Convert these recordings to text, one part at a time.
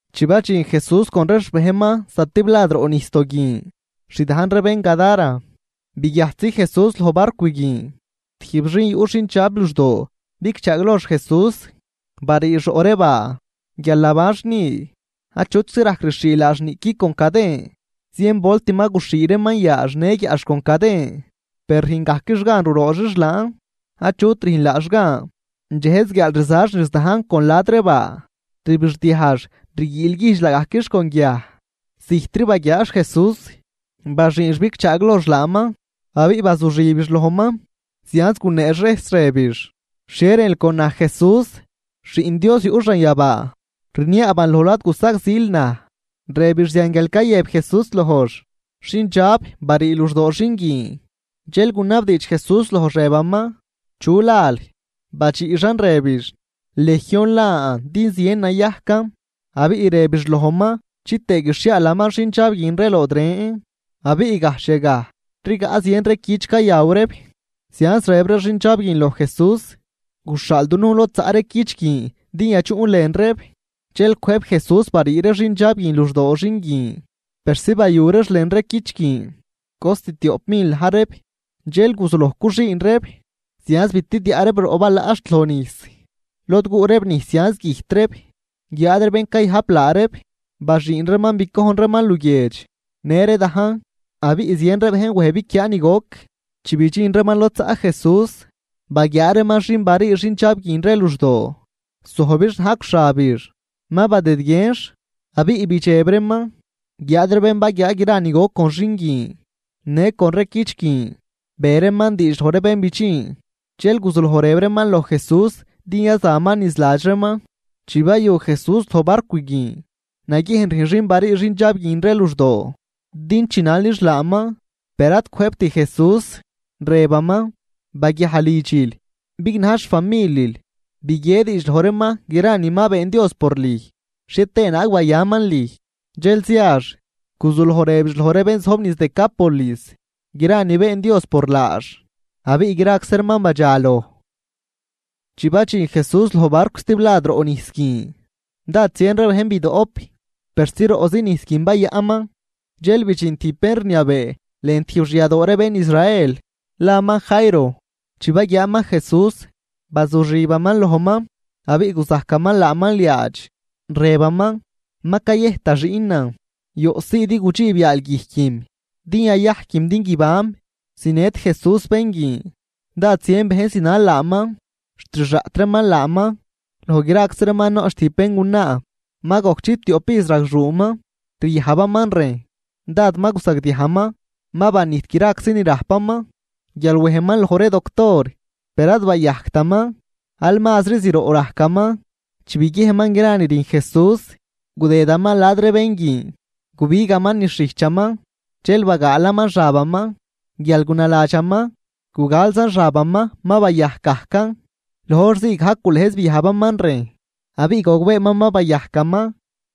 Chi badxin Jesús con ree xbejnman zatiblad roꞌ nijsdoo guin, xdajn ree bén Gadara, baguiajtzi Jesús loj barcw guin, tijb xin yuꞌ xindxab luxdoo bigchaaglojx Jesús. Bariix roꞌ ree baa, guial nabanx ni. Achutczi rajc rixhii laax niꞌqui con caden. Zien volt ma guxhii reeman yaax në guiaꞌx con caden, per rüjngajquix gan rurooxix laan. Achut rüjn laax gan. Dxejz guiaal rizax niz dajn con la̱d ree baa, rbixdiajx rguiilguijdx laagajquix con guiaj. Zijtri baguiaax Jesús, baxüünx bigchaaglojx laaman abiꞌ bazuxibix lojman. Zianz guneex rejs rëbix: ―¿Xhie rënl con naj Jesús, Xiꞌn Dios yuꞌ xanyabaa? Rniaaban lojl ad gusagzil naj. Rëbix zian, guial cayëb Jesús lojx: ―¡Xindxab, barii luxdoo xin guin! Dxel gunabdiidx Jesús lojx rëbaman: ―¿Chu lal? Badxiꞌxan rëbix: ―Legión lan din zien nayajcan. Abiꞌ rëbix lojman chitëë guixhiaalaman xindxab guin ree lood ren. Abiꞌ gajxh yagaj rigaꞌ zien ree cüch cayaw reeb. Zianz rëb ree xindxab guin loj Jesús: ―Guxhaal dunujn lod zaꞌ ree cüch guin din yadxuꞌn lën reeb. Dxel cwëjb Jesús barii ree xindxab guin luxdoo xin guin persi bayu reex lën ree cüch guin. Cost tioꞌp mil na̱j reeb. Dxel guzuloj cuxüün reeb, zianz bitidyaꞌ reeb roꞌ balaꞌ xt lojnijs, lod guꞌ reeb nijs zianz güjt reeb. Guiáad ree bén cayajp laa reeb, baxüün reeman bicojn reeman luguiedx në ree dajn abiꞌ zien ree bejn wej biquiaa ni goc. Chi bidxin reeman lod zaꞌ Jesús, baguiaa reeman xin barii xindxab guin ree luxdoo, zojbix najcw xabix, ma badëdguienx. Abiꞌ bidxeb reeman. Guiáad ree bén baguiaa gra ni goc con xin guin, në con ree cüch guin, be reeman diidx loj ree bén bidxin. Dxel guzuloj rëb reeman loj Jesús din yazaman niz ladx reeman. Chi bayu Jesús loj barcw guin, naguiejn rüjn xin barii xindxab guin ree luxdoo din chinalix laaman. Per ad cwëjbt Jesús, rëbaman: ―Baguiaj lidxil, bignaj xfamilil, biguie diidx loj reeman gra ni ma been Dios por lüj, xhie tëë naag bayaman lüj. Dxel ziax, guzuloj rëbix loj ree bén zojb niz Decápolis gra ni been Dios por laax, abiꞌ graczi reeman badxaloj. Chi badxin Jesús loj barcw stiblad roꞌ nijs guin, dád zien ree bejn bidoꞌp, persi roꞌzi nijs guin bayaꞌnman. Dxel bidxin tijb bén rniabee lën tijb xyadoo ree bén Israel, laman Jairo. Chi baguiaaman Jesús, bazuxibaman lojman, abiꞌ guzajcaman laaman liaadx, rëbaman: ―Ma cayëjt da xiꞌnan. Yoꞌsii din gudxiib yaal guijquim din yayajquim din guibanm. Zinët Jesús bén guin, dád zien bejn zinal laaman xt rixaꞌt reeman laaman. Loj graczi reeman noꞌch tijb béngunaa, ma gojc chiptioꞌp ijz ragxuuman ryajbaman rejn. Dád ma guzagdiajman, ma banijt graczi ni rajpaman guial wejman loj ree doctor, per ad bayajctaman, aal mazri zroꞌ rajcaman. Chi biguiejnman gra ni rüjn Jesús, gudëdaman la̱d ree bén guin, gubigaman niz xijchaman dxel bagaalaman xabaman. Guial gunaladxaman: “Gugalzan xabaman, ma bayajc gajcan.” Loj hor zii gajc gulëjz biajbaman rejn, abiꞌ gogbeeman ma bayajcaman.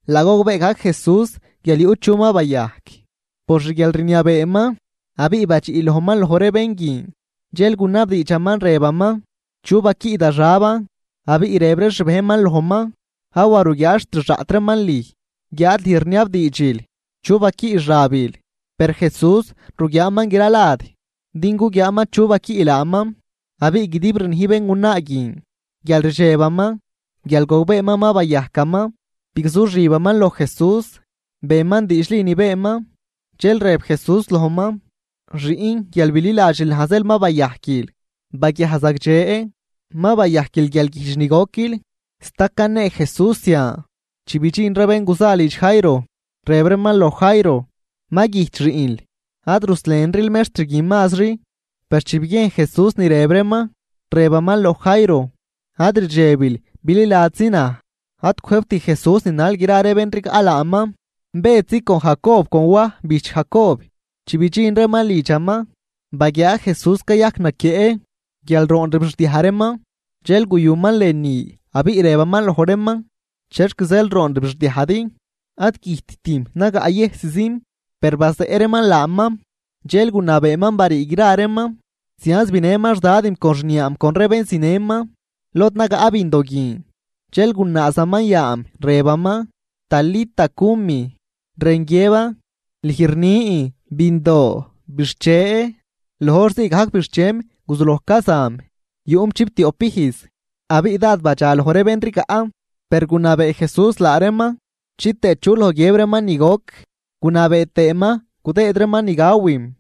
Laa gogbee gajc Jesús guial yuꞌ chu ma bayajc por xguialrniabeeman, abiꞌ badxiꞌ lojman loj ree bén guin dxel gunabdiidxaman, rëbaman: ―¿Chu baquiꞌ da xaban? Abiꞌ rëb ree xbejnman lojman: ―Awa ruguiaal xt rixaꞌt reeman lüj guiáad lüj rniabdiidxil chu baquiꞌ xabil. Per Jesús ruguiaaman gra lad din guguiaaman chu baquiꞌ laaman. Abiꞌ guidib rnij béngunaa guin guial rdxebaman, guial gogbeeman ma bayajcaman, bigzuxibaman loj Jesús, beman diidxli ni beenman. Dxel rëb Jesús lojman: ―Xiꞌn, guial bililadxil naj zeel ma bayajquil. Baguiaj zagdxe. Ma bayajquil guialguijdx ni goquil. Sta canee Jesús zian, chi bidxin ree bén guza lidx Jairo, rëb reeman loj Jairo: ―Ma güjt xiꞌnl. Ad ruslenril mextr guin mazri. Per chi biguiejn Jesús ni rëb reeman, rëbaman loj Jairo: ―Ad rdxebil, bililadxzi naj. Ad cwëjbt Jesús ninal gra ree bén rigaꞌ laaman, Bëdzi, con Jacob, con Waj bijch Jacob. Chi bidxin reeman lidxaman, baguiaa Jesús cayajc naquieꞌ guial roon rbixdiaj reeman. Dxel guyuman lënü abiꞌ rëbaman loj reeman: ―¿Chexc zeel roon rbixdiajdi? Ad güjttim, nagaꞌyëjsim. Per bazeꞌ reeman laaman. Dxel gunabeeman barii gra reeman, zianz binëman xdadim con xniaam con ree bén zinëman, lod nagaꞌ bindo guin. Dxel gunaazaman yaam rëbaman: ―Talita, cumi ―Rën guiëban: Lüj rnin, bindoo, bixche. Loj hor ziigajc bixchem guzuloj cazam. Yuꞌm chiptioꞌp ijz. Abiꞌ dád badxa loj ree bén rigaꞌ. Per gunabee Jesús laa reeman chitëë chu loj guiëb reeman ni goc, gunabee tëëman gudëëd reeman ni gawim.